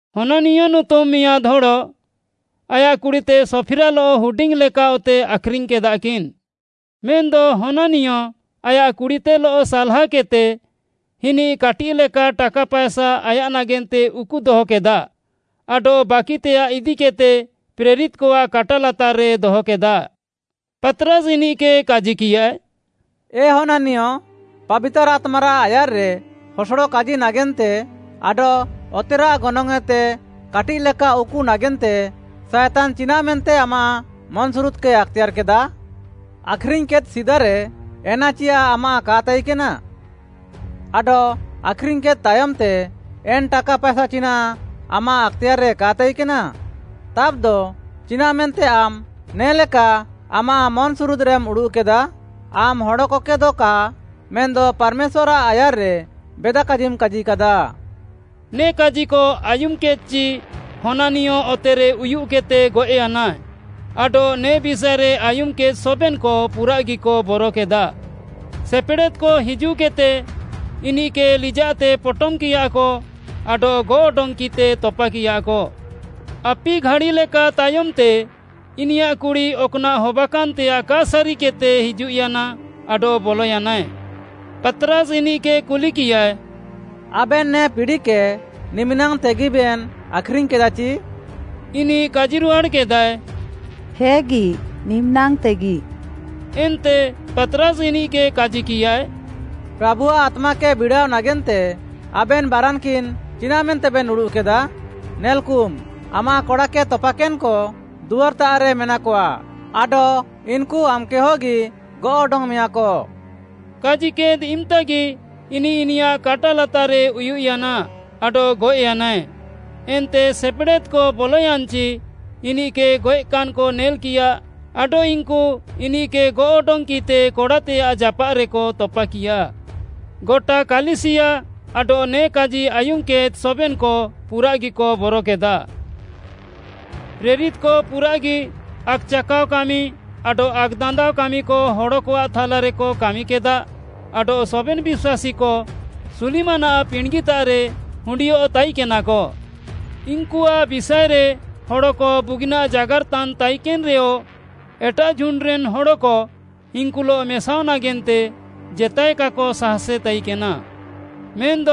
ହନାନିୟ ନୁତୁମ୍‌ ମିଆଁଦ୍‌ ହଡ଼ ଆୟାଃ କୁଡ଼ିତେ ସଫିରାଲଃ ହୁଡିଙ୍ଗ୍‌ଲେକା ଅତେ ଆଖ୍‌ରିଙ୍ଗ୍‌କେଦାକିନ୍‌। ମେନ୍‌ଦ ହନାନିୟ ଆୟାଃ କୁଡ଼ିତେଲଃ ସାଲ୍‌ହାକେଦ୍‌ତେ, ଇନିଃ କାଟିଃଲେକା ଟାକା ପାଏସା ଆୟାଃ ନାଗେନ୍ତେ ଉକୁ ଦହକେଦା ଆଡଃ ବାକିତେୟାଃ ଇଦିକେଦ୍‌ତେ ପ୍ରେରିତ୍‌କଆଃ କାଟା ଲାତାର୍‌ରେ ଦହକେଦା। ପାତ୍‌ରାସ୍‌ ଇନିଃକେ କାଜିକିୟାଏ, “ଏ ହନାନିୟ, ପାବିତାର୍‌ ଆତ୍ମାରାଃ ଆୟାର୍‌ରେ ହସଡ଼ କାଜି ନାଗେନ୍ତେ ଆଡଃ ଅତେରାଃ ଗନଙ୍ଗ୍‌ଏତେ କାଟିଃଲେକା ଉକୁ ନାଗେନ୍ତେ ସାଏତାନ୍‌ ଚିନାଃମେନ୍ତେ ଆମାଃ ମନ୍‌ସୁରୁଦ୍‌କେ ଆକ୍‌ତେୟାର୍‌କେଦା? ଆଖ୍‌ରିଙ୍ଗ୍‌କେଦ୍‌ ସିଦାରେ ଏନା ଚିୟାଃ ଆମାଃ କା ତାଇକେନା? ଆଡଃ ଆଖ୍‌ରିଙ୍ଗ୍‌କେଦ୍‌ ତାୟମ୍‌ତେ ଏନ୍‌ ଟାକା ପାଏସା ଚିନାଃ ଆମାଃ ଆକ୍‌ତେୟାର୍‌ରେ କା ତାଇକେନା? ତାବ୍‌ଦ ଚିନାଃମେନ୍ତେ ଆମ୍‌ ନେ'ଲେକା ଆମାଃ ମନ୍‌ସୁରୁଦ୍‌ରେମ୍‌ ଉଡ଼ୁଃକେଦା? ଆମ୍‌ ହଡ଼କକେଦ କା ମେନ୍‌ଦ ପାର୍‌ମେଶ୍ୱାର୍‌ଆଃ ଆୟାର୍‌ରେ ବେଦାକାଜିମ୍‌ କାଜିକାଦା।” ନେ କାଜିକ ଆୟୁମ୍‌କେଦ୍‌ଚି ହନାନିୟ ଅତେରେ ଉୟୁଃକେଦ୍‌ତେ ଗଏଃୟାନା, ଆଡଃ ନେ ବିଷାଏରେ ଆୟୁମ୍‌କେଦ୍‌ ସବେନ୍‌କ ପୁରାଃଗିକ ବରକେଦା। ସେପେଡ଼େଦ୍‍କ ହିଜୁଃକେଦ୍‌ତେ ଇନିଃକେ ଲିଜାଃତେ ପଟମ୍‍କିୟାକ ଆଡଃ ଗଅଃ ଅଡଙ୍ଗ୍‌କିତେ ତପାକିୟାକ। ଆପି ଘାଡ଼ିଲେକା ତାୟମ୍‌ତେ ଇନିୟାଃ କୁଡ଼ି ଅକ୍‌ନାଃ ହବାକାନ୍‌ତେୟାଃ କା ସାରିକେଦ୍‌ତେ ହିଜୁଃୟାନା ଆଡଃ ବଲୟାନାଏ। ପାତ୍‌ରାସ୍‌ ଇନିଃକେ କୁଲିକିୟାଏ, “ଆବେନ୍ ନେ ପିଡ଼ିକେ ନିମ୍‍ନାଙ୍ଗ୍‌ତେଗିବେନ୍ ଆଖ୍‌ରିଙ୍ଗ୍‌କେଦାଚି?” ଇନିଃ କାଜିରୁହାଡ଼୍‌କେଦାଏ, “ହେଗି, ନିମିନାଙ୍ଗ୍‌ତେଗି।” ଏନ୍ତେ ପାତ୍‌ରାସ୍‌ ଇନିଃକେ କାଜିକିୟାଏ, “ପ୍ରାଭୁଆଃ ଆତ୍ମାକେ ବିଡ଼ାଅ ନାଗେନ୍ତେ ଆବେନ୍‌ ବାରାନ୍‌କିନ୍‌ ଚିନାଃ ମେନ୍ତେବେନ୍ ଉଡ଼ୁଃକେଦା? ନେଲ୍‌କୁମ୍, ଆମାଃ କଡ଼ାକେ ତପାକେନ୍‍କ ଦୁଆର୍‌ତାଃରେ ମେନାକଆ ଆଡଃ ଇନ୍‌କୁ ଆମ୍‌କେ ହଗି ଗଅଃ ଅଡଙ୍ଗ୍‌ମେୟାଁକ।” କାଜିକେଦ୍‌ ଇମ୍‍ତାଗି ଇନିଃ ଇନିୟାଃ କାଟା ଲାତାର୍‌ରେ ଉୟୁଃୟାନା ଆଡଃ ଗଏଃୟାନାଏ। ଏନ୍ତେ ସେପେଡ଼େଦ୍‍କ ବଲୟାନ୍‌ଚି ଇନିଃକେ ଗଏଃକାନ୍‌କ ନେଲ୍‌କିୟା ଆଡଃ ଇନ୍‌କୁ ଇନିଃକେ ଗଅଃ ଅଡଙ୍ଗ୍‌କିତେ କଡ଼ାତେୟାଃ ଜାପାଃରେକ ତପାକିୟା। ଗଟା କାଲିସିୟା ଆଡଃ ନେ କାଜି ଆୟୁମ୍‌କେଦ୍‌ ସବେନ୍‌କ ପୁରାଃଗିକ ବରକେଦା। ପ୍ରେରିତ୍‌କ ପୁରାଃଗି ଆକ୍‌ଚାକାଅ କାମି ଆଡଃ ଆକ୍‌ଦାନ୍ଦାଅ କାମିକ ହଡ଼କଆଃ ଥାଲାରେକ କାମିକେଦା ଆଡଃ ସବେନ୍‌ ବିଶ୍ୱାସୀକ ସୁଲିମାନ୍‌ଆଃ ପିଣ୍ଡ୍‌ଗିତାଃରେ ହୁଣ୍ଡିୟଃ ତାଇକେନାକ। ଇନ୍‌କୁଆଃ ବିଷାଏରେ ହଡ଼କ ବୁଗିନାଃ ଜାଗାର୍‌ତାନ୍‌ ତାଇକେନ୍‌ରେୟ ଏଟାଃ ଝୁଣ୍ଡ୍‌ରେନ୍‌ ହଡ଼କ ଇନ୍‌କୁଲଃ ମେସାଅଃ ନାଗେନ୍ତେ ଜେତାଏ କାକ ସାହାସେ ତାଇକେନା। ମେନ୍‌ଦ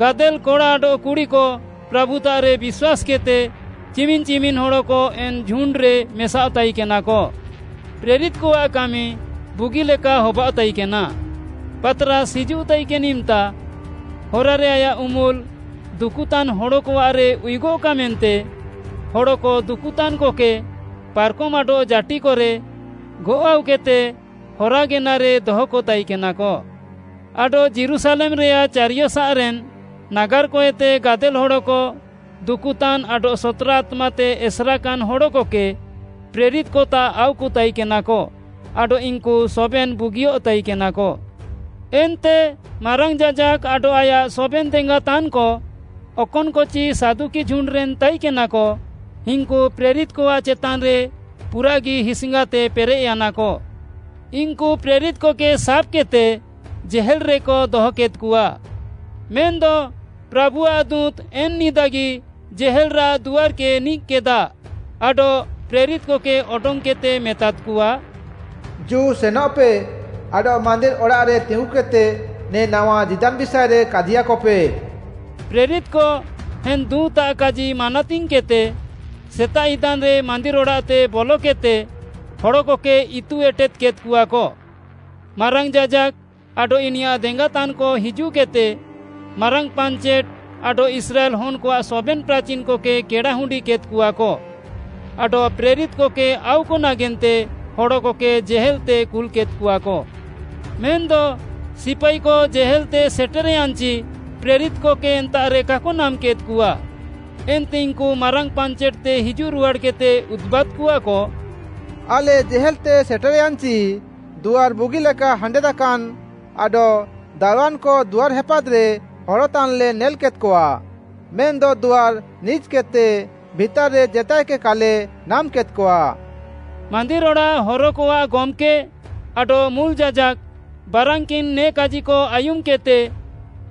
ଗାଦେଲ୍‌ କଡ଼ା ଆଡଃ କୁଡ଼ିକ ପ୍ରାଭୁତାଃରେ ବିଶ୍ୱାସ୍‌କେଦ୍‌ତେ ଚିମିନ୍‌ ଚିମିନ୍‌ ହଡ଼କ ଏନ୍‌ ଝୁଣ୍ଡ୍‌ରେ ମେସାଅଃ ତାଇକେନାକ। ପ୍ରେରିତ୍‌କଆଃ କାମି ବୁଗିଲେକା ହବାଅଃ ତାଇକେନା, ପାତ୍‌ରାସ୍‌ ହିଜୁଃ ତାଇକେନ୍‌ ଇମ୍‌ତା ହରାରେ ଆୟାଃ ଉମ୍ୱୁଲ୍ ଦୁକୁତାନ୍‍ ହଡ଼କଆଃରେ ଉୟୁଗଃକା ମେନ୍ତେ ହଡ଼କ ଦୁକୁତାନ୍‌କକେ ପାର୍‌କମ୍‌ ଆଡଃ ଜାଟିକରେ ଗଅଃ ଆଉକେଦ୍‌ତେ ହରାଗେନାରେ ଦହକ ତାଇକେନାକ। ଆଡଃ ଯୀରୁଶାଲେମ୍‌ରେୟାଃ ଚାରିୟସାଃରେନ୍ ନାଗାର୍‌କଏତେ ଗାଦେଲ୍‌ ହଡ଼କ ଦୁକୁତାନ୍‌ ଆଡଃ ସତ୍‌ରା ଆତ୍ମାତେ ଏସେରାକାନ୍‌ ହଡ଼କକେ ପ୍ରେରିତ୍‌କତାଃ ଆଉକତାଇକେନାକ ଆଡଃ ଇନ୍‌କୁ ସବେନ୍‌ ବୁଗିୟଃ ତାଇକେନାକ। ଏନ୍ତେ ମାରାଙ୍ଗ୍‌ ଯାଜାକ୍‌ ଆଡଃ ଆୟାଃ ସବେନ୍‌ ଦେଙ୍ଗାତାନ୍‌କ, ଅକନ୍‌କଚି ସାଦୁକି ଝୁଣ୍ଡ୍‌ରେନ୍‌ ତାଇକେନାକ, ଇନ୍‌କୁ ପ୍ରେରିତ୍‌କଆଃ ଚେତାନ୍‌ରେ ପୁରାଃଗି ହିସ୍‌ଙ୍ଗାତେ ପେରେଃୟାନାକ। ଇନ୍‌କୁ ପ୍ରେରିତ୍‌କକେ ସାବ୍‌କେଦ୍‌ତେ ଥାନାରେକ ଦହକେଦ୍‌କଆ। ମେନ୍‌ଦ ପ୍ରାଭୁଆଃ ଦୁଁତ୍‌ ଏନ୍‌ ନିଦାଗି ଥାନାରାଃ ଦୁଆର୍‌କେ ନିକ୍‌କେଦା, ଆଡଃ ପ୍ରେରିତ୍‌କକେ ଅଡଙ୍ଗ୍‌କେଦ୍‌ତେ ମେତାଦ୍‌କଆ, “ଜୁ, ସେନଃପେ, ଆଡଃ ମାନ୍ଦିର୍‌ ଅଡ଼ାଃରେ ତିଙ୍ଗୁକେଦ୍‌ତେ ନେ ନାୱା ଜୀଦାନ୍‌ ବିଷାଏରେ କାଜିୟାକପେ।” ପ୍ରେରିତ୍‌କ ଏନ୍‌ ଦୁଁତ୍‌ଆଃ କାଜି ମାନାତିଙ୍ଗ୍‌କେଦ୍‌ତେ ସେତାଃ ଇଦାନ୍‌ରେ ମାନ୍ଦିର୍‌ ଅଡ଼ାଃତେ ବଲକେଦ୍‌ତେ ହଡ଼କକେ ଇତୁ ଏଟେଦ୍‌କେଦ୍‌କଆକ। ମାରାଙ୍ଗ୍‌ ଯାଜାକ୍‌ ଆଡଃ ଇନିୟାଃ ଦେଙ୍ଗାତାନ୍‌କ ହିଜୁଃକେଦ୍‌ତେ, ମାରାଙ୍ଗ୍‌ ପାଞ୍ଚେଟ୍‌ ଆଡଃ ଇସ୍ରାଏଲ୍‌ ହନ୍‌କଆଃ ସବେନ୍‌ ପ୍ରାଚୀନ୍‌କକେ କେଡ଼ା ହୁଣ୍ଡିକେଦ୍‍କଆକ ଆଡଃ ପ୍ରେରିତ୍‌କକେ ଆଉକ ନାଗେନ୍ତେ ହଡ଼କକେ ଜେହେଲ୍‌ତେ କୁଲ୍‌କେଦ୍‍କଆକ। ମେନ୍‌ଦ ସିପାଇକ ଥାନାତେ ସେଟେର୍‌ୟାନ୍‌ଚି ପ୍ରେରିତ୍‌କକେ ଏନ୍ତାଃରେ କାକ ନାମ୍‌କେଦ୍‌କଆ, ଏନ୍ତେ ଇନ୍‌କୁ ମାରାଙ୍ଗ୍‌ ପାଞ୍ଚେଟ୍‌ତେ ହିଜୁଃରୁହାଡ଼୍‌କେଦ୍‌ତେ ଉଦୁବାଦ୍‌କଆକ, “ଆଲେ ଜେହେଲ୍‌ତେ ସେଟେର୍‌ୟାନ୍‌ଚି ଦୁଆର୍‌ ବୁଗିଲେକା ହାଣ୍ଡେଦାକାନ୍‌ ଆଡଃ ଦାରୱାନ୍‌କ ଦୁଆର୍‌ ହେପାଦ୍‌ରେ ହରତାନ୍‌ଲେ ନେଲ୍‌କେଦ୍‌କଆ, ମେନ୍‌ଦ ଦୁଆର୍‌ ନିଜ୍‌କେଦ୍‌ତେ ଭିତାର୍‍ରେ ଜେତାଏକେ କାଲେ ନାମ୍‍କେଦ୍‌କଆ।” ମାନ୍ଦିର୍‌ ଅଡ଼ାଃ ହରକଆଃ ଗମ୍‌କେ ଆଡଃ ମୁଲ୍‌ ଯାଜାକ୍‌ ବାରାନ୍‌କିନ୍‌ ନେ କାଜିକ ଆୟୁମ୍‌କେଦ୍‌ତେ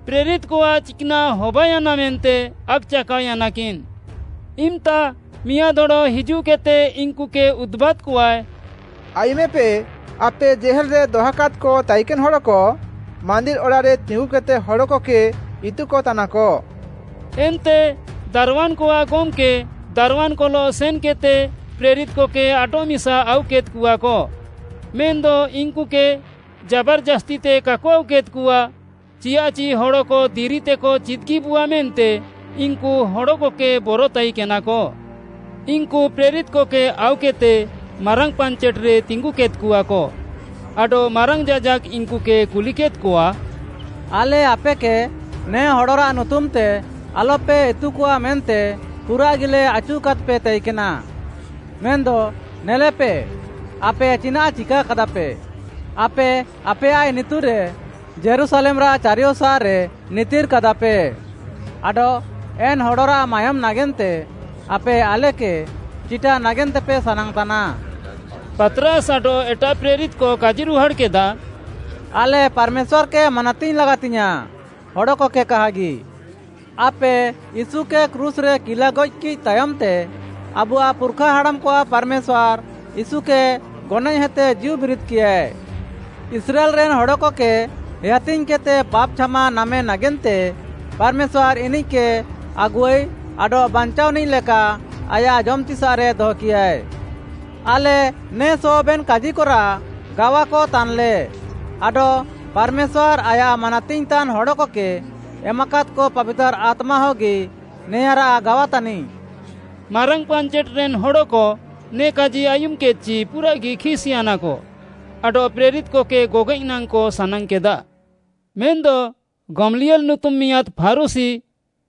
ପ୍ରେରିତ୍‌କଆଃ ଚିକ୍‌ନାଃ ହବାୟାନା ମେନ୍ତେ ଆକ୍‌ଚାକାଅୟାନାକିନ୍‌। ଇମ୍‌ତା ମିଆଁଦ୍‌ ହଡ଼ ହିଜୁଃକେଦ୍‌ତେ ଇନ୍‌କୁକେ ଉଦୁବାଦ୍‌କଆଏ, “ଆୟୁମେପେ, ଆପେ ଥାନାରେ ଦହକାଦ୍‌କ ତାଇକେନ୍‌ ହଡ଼କ, ମାନ୍ଦିର୍‌ ଅଡ଼ାଃରେ ତିଙ୍ଗୁକେଦ୍‌ତେ ହଡ଼କକେ ଇତୁକତାନାକ।” ଏନ୍ତେ ଦାରୱାନ୍‌କଆଃ ଗମ୍‌କେ, ଦାରୱାନ୍‌କଲଃ ସେନ୍‌କେଦ୍‌ତେ ପ୍ରେରିତ୍‌କକେ ଆଡଃମିସା ଆଉକେଦ୍‌କଆକ। ମେନ୍‌ଦ ଇନ୍‌କୁକେ ଜାବାର୍‌ଜାସ୍ତିତେ କାକ ଆଉକେଦ୍‌କଆ, ଚିୟାଃଚି ହଡ଼କ ଦିରିତେକ ଚିଦ୍‌ଗିବୁଆ ମେନ୍ତେ ଇନ୍‌କୁ ହଡ଼କକେ ବର ତାଇକେନାକ। ଇନ୍‌କୁ ପ୍ରେରିତ୍‌କକେ ଆଉକେଦ୍‌ତେ ମାରାଙ୍ଗ୍‌ ପାଞ୍ଚେଟ୍‌ରେ ତିଙ୍ଗୁକେଦ୍‍କଆକ, ଆଡଃ ମାରାଙ୍ଗ୍‌ ଯାଜାକ୍‌ ଇନ୍‌କୁକେ କୁଲିକେଦ୍‌କଆ, “ଆଲେ ଆପେକେ ନେ ହଡ଼ରାଃ ନୁତୁମ୍‌ତେ ଆଲ୍‌ପେ ଇତୁକଆ ମେନ୍ତେ ପୁରାଃଗିଲେ ଆଚୁକାଦ୍‌ପେ ତାଇକେନା, ମେନ୍‌ଦ ନେଲେପେ ଆପେ ଚିନାଃ ଚିକାକାଦାପେ, ଆପେ ଆପେୟାଃ ଇନିତୁରେ ଯୀରୁଶାଲେମ୍‌ରାଃ ଚାରିୟସାଃରେ ନିତିର୍‌କାଦାପେ ଆଡଃ ଏନ୍‌ ହଡ଼ରାଃ ମାୟୋମ୍‌ ନାଗେନ୍ତେ ଆପେ ଆଲେକେ ଚିଟା ନାଗେନ୍ତେପେ ସାନାଙ୍ଗ୍‌ତାନା।” ପାତ୍‌ରାସ୍‌ ଆଡଃ ଏଟାଃ ପ୍ରେରିତ୍‌କ କାଜିରୁହାଡ଼୍‌କେଦା, “ଆଲେ ପାର୍‌ମେଶ୍ୱାର୍‌କେ ମାନାତିଙ୍ଗ୍‌ ଲାଗାତିୟାଁ, ହଡ଼କକେ କାହାଗି। ଆପେ ୟୀଶୁକେ କ୍ରୁଶ୍‌ରେ କିଲାଗଏଃକିଃ ତାୟମ୍‌ତେ ଆବୁଆଃ ପୁର୍‌ଖାହାଡ଼ାମ୍‌କଆଃ ପାର୍‌ମେଶ୍ୱାର୍‌, ୟୀଶୁକେ ଗନଏଃହେତେ ଜୀଉବିରିଦ୍‌କିୟାଏ। ଇସ୍ରାଏଲ୍‌ରେନ୍‌ ହଡ଼କକେ ହେୟାତିଙ୍ଗ୍‌କେଦ୍‌ତେ ପାପ୍‌ ଛାମା ନାମେ ନାଗେନ୍ତେ ପାର୍‌ମେଶ୍ୱାର୍‌ ଇନିଃକେ ଆଗୁଆଇ ଆଡଃ ବାଞ୍ଚାଅନିଃ ଲେକା ଆୟାଃ ଜମ୍‌ତିସାଃରେ ଦହକିୟାଏ। ଆଲେ ନେ ସବେନ୍‌ କାଜିକରାଃ ଗାୱାକ ତାନ୍‍ଲେ ଆଡଃ ପାର୍‌ମେଶ୍ୱାର୍‌, ଆୟାଃ ମାନାତିଙ୍ଗ୍‌ତାନ୍‌ ହଡ଼କକେ ଏମାକାଦ୍‌କ ପାବିତାର୍‌ ଆତ୍ମାହଗି ନେଆଁଁରାଃ ଗାୱାତାନିଃ।” ମାରାଙ୍ଗ୍‌ ପାଞ୍ଚେଟ୍‌ରେନ୍‌ ହଡ଼କ ନେ କାଜି ଆୟୁମ୍‌କେଦ୍‌ଚି ପୁରାଃଗି ଖିସ୍‌ୟାନାକ ଆଡଃ ପ୍ରେରିତ୍‌କକେ ଗଗଏଃ ନାଙ୍ଗ୍‌କ ସାନାଙ୍ଗ୍‌କେଦା। ମେନ୍‌ଦ ଗମଲିଏଲ୍‌ ନୁତୁମ୍‌ ମିଆଁଦ୍‌ ଫାରୁଶୀ,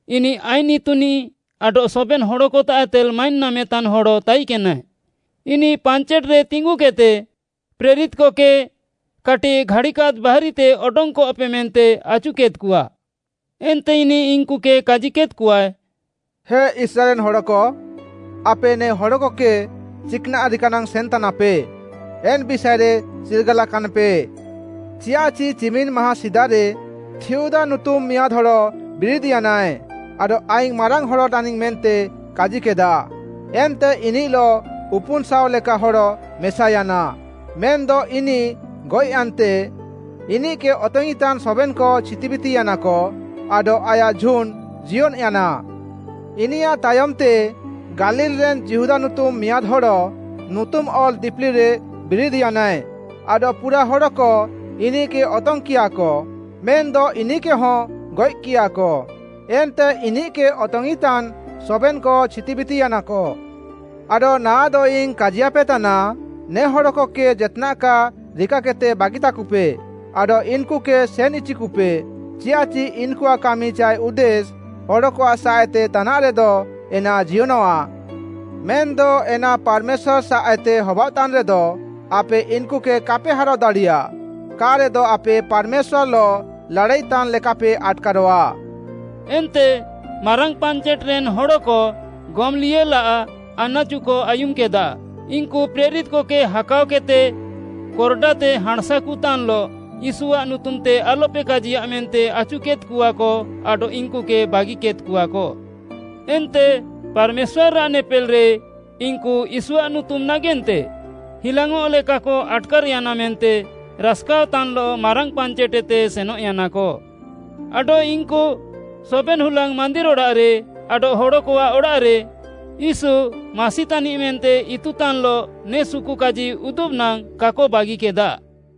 ଇନିଃ ଆଇନ୍‌ ଇତୁନିଃ ଆଡଃ ସବେନ୍‌ ହଡ଼କତାଃଏତେ ମାଇନ୍‌ ନାମେତାନ୍‌ ହଡ଼ ତାଇକେନାଏ। ଇନିଃ ପାଞ୍ଚେଟ୍‌ରେ ତିଙ୍ଗୁକେଦ୍‌ତେ ପ୍ରେରିତ୍‌କକେ କାଟିଃ ଘାଡ଼ିକାଦ୍ ବାହାରିତେ ଅଡଙ୍ଗ୍‌କପେ ମେନ୍ତେ ଆଚୁକେଦ୍‍କଆ। ଏନ୍ତେ ଇନିଃ ଇନ୍‌କୁକେ କାଜିକେଦ୍‍କଆଏ, “ହେ ଇସ୍ରାଏଲ୍‌ରେନ୍‌ ହଡ଼କ, ଆପେ ନେ ହଡ଼କକେ ଚିକ୍‌ନାଃ ରିକାନାଙ୍ଗ୍‌ ସେନ୍‌ତାନାପେ ଏନ୍‌ ବିଷାଏରେ ଚିର୍ଗାଲାକାନ୍‍ପେ। ଚିୟାଃଚି ଚିମିନ୍‌ ମାହାଁଁ ସିଦାରେ ଥିଉଦା ନୁତୁମ୍‌ ମିଆଁଦ୍‌ ହଡ଼ ବିରିଦ୍‌ୟାନାଏ ଆଡଃ ଆଇଙ୍ଗ୍‌ ମାରାଙ୍ଗ୍‌ ହଡ଼ ତାନିଙ୍ଗ୍‌ ମେନ୍ତେ କାଜିକେଦା, ଏନ୍ତେ ଇନିଃଲଃ ଉପୁନ୍‌ଶାଅ ଲେକା ହଡ଼କ ମେସାୟାନା। ମେନ୍‌ଦ ଇନିଃ ଗଏଃୟାନ୍ତେ, ଇନିଃକେ ଅତଙ୍ଗ୍‌ଇଁତାନ୍‌ ସବେନ୍‌କ ଛିତିବିତିୟାନାକ ଆଡଃ ଆୟାଃ ଝୁଣ୍ଡ୍‌ ଜିୟନ୍‌ୟାନା। ଇନିୟାଃ ତାୟମ୍‌ତେ, ଗାଲିଲ୍‌ରେନ୍ ଯିହୁଦା ନୁତୁମ୍‌ ମିଆଁଦ୍‌ ହଡ଼, ନୁତୁମ୍‌ ଅଲ୍‌ ଦିପିଲିରେ ବିରିଦ୍‌ୟାନାଏ ଆଡଃ ପୁରାଃ ହଡ଼କ ଇନିଃକେ ଅତଙ୍ଗ୍‌କିୟାକ ମେନ୍‌ଦ ଇନିଃକେହଁ ଗଏଃକିୟାକ, ଏନ୍ତେ ଇନିଃକେ ଅତଙ୍ଗ୍‌ଇଁତାନ୍‌ ସବେନ୍‌କ ଛିତିବିତିୟାନାକ। ଆଡଃ ନାଆଃଦଇଙ୍ଗ୍‌ କାଜିୟାପେତାନା, ନେ ହଡ଼କକେ ଜେତ୍‌ନାଃ କା ରିକାକେଦ୍‌ତେ ବାଗିତାକୁପେ ଆଡଃ ଇନ୍‌କୁକେ ସେନ୍‌ ଇଚିକୁପେ ଚିୟାଃଚି ଇନ୍‌କୁଆଃ କାମି ଚାଏ ଉଦ୍ଦେଶ୍‌ ହଡ଼କଆଃ ସାଃଏତେ ତାନାଃରେଦ ଏନା ଜିୟନଃଆ। ମେନ୍‌ଦ ଏନା ପାର୍‌ମେଶ୍ୱାର୍‌ ସାଃଏତେ ହବାଅଃତାନ୍‌ରେଦ, ଆପେ ଇନ୍‌କୁକେ କାପେ ହାରାଅ ଦାଡ଼ିୟା, କା'ରେଦ ଆପେ ପାର୍‌ମେଶ୍ୱାର୍‌ଲଃ ଲାଡ଼ାଇତାନ୍‌ ଲେକାପେ ଆଟ୍‌କାରଃଆ।” ଏନ୍ତେ ମାରାଙ୍ଗ୍‌ ପାଞ୍ଚେଟ୍‌ରେନ୍‌ ହଡ଼କ ଗମଲିଏଲ୍‌ଆଃ ଆନାଚୁକ ଆୟୁମ୍‌କେଦା। ଇନ୍‌କୁ ପ୍ରେରିତ୍‌କକେ ହାକାଅକେଦ୍‌ତେ କୋର୍‌ଡାତେ ହାଁଣ୍‌ସାକୁତାନ୍‌ଲଃ ୟୀଶୁଆଃ ନୁତୁମ୍‌ତେ ଆଲ୍‌ପେ କାଜିୟା ମେନ୍ତେ ଆଚୁକେଦ୍‌କଆକ ଆଡଃ ଇନ୍‌କୁକେ ବାଗିକେଦ୍‌କଆକ। ଏନ୍ତେ ପାର୍‌ମେଶ୍ୱାରାଃ ନେପେଲ୍‌ରେ ଇନ୍‌କୁ ୟୀଶୁଆଃ ନୁତୁମ୍‌ ନାଗେନ୍ତେ ହିଲାଙ୍ଗ୍‌ଅଃଲେକାକ ଆଟ୍‌କାର୍‍ୟାନା ମେନ୍ତେ ରାସ୍‍କାଅଃତାନ୍‍ଲଃ ମାରାଙ୍ଗ୍‌ ପାଞ୍ଚେଟ୍‌ଏତେ ସେନଃୟାନାକ। ଆଡଃ ଇନ୍‌କୁ ସବେନ୍‌ ହୁଲାଙ୍ଗ୍‌ ମାନ୍ଦିର୍‌ ଅଡ଼ାଃରେ ଆଡଃ ହଡ଼କଆଃ ଅଡ଼ାଃରେ ୟୀଶୁ, ମାସି ତାନିଃ ମେନ୍ତେ ଇତୁତାନ୍‌ଲଃ ନେ ସୁକୁକାଜି ଉଦୁବ୍‌ ନାଙ୍ଗ୍‌ କାକ ବାଗିକେଦା।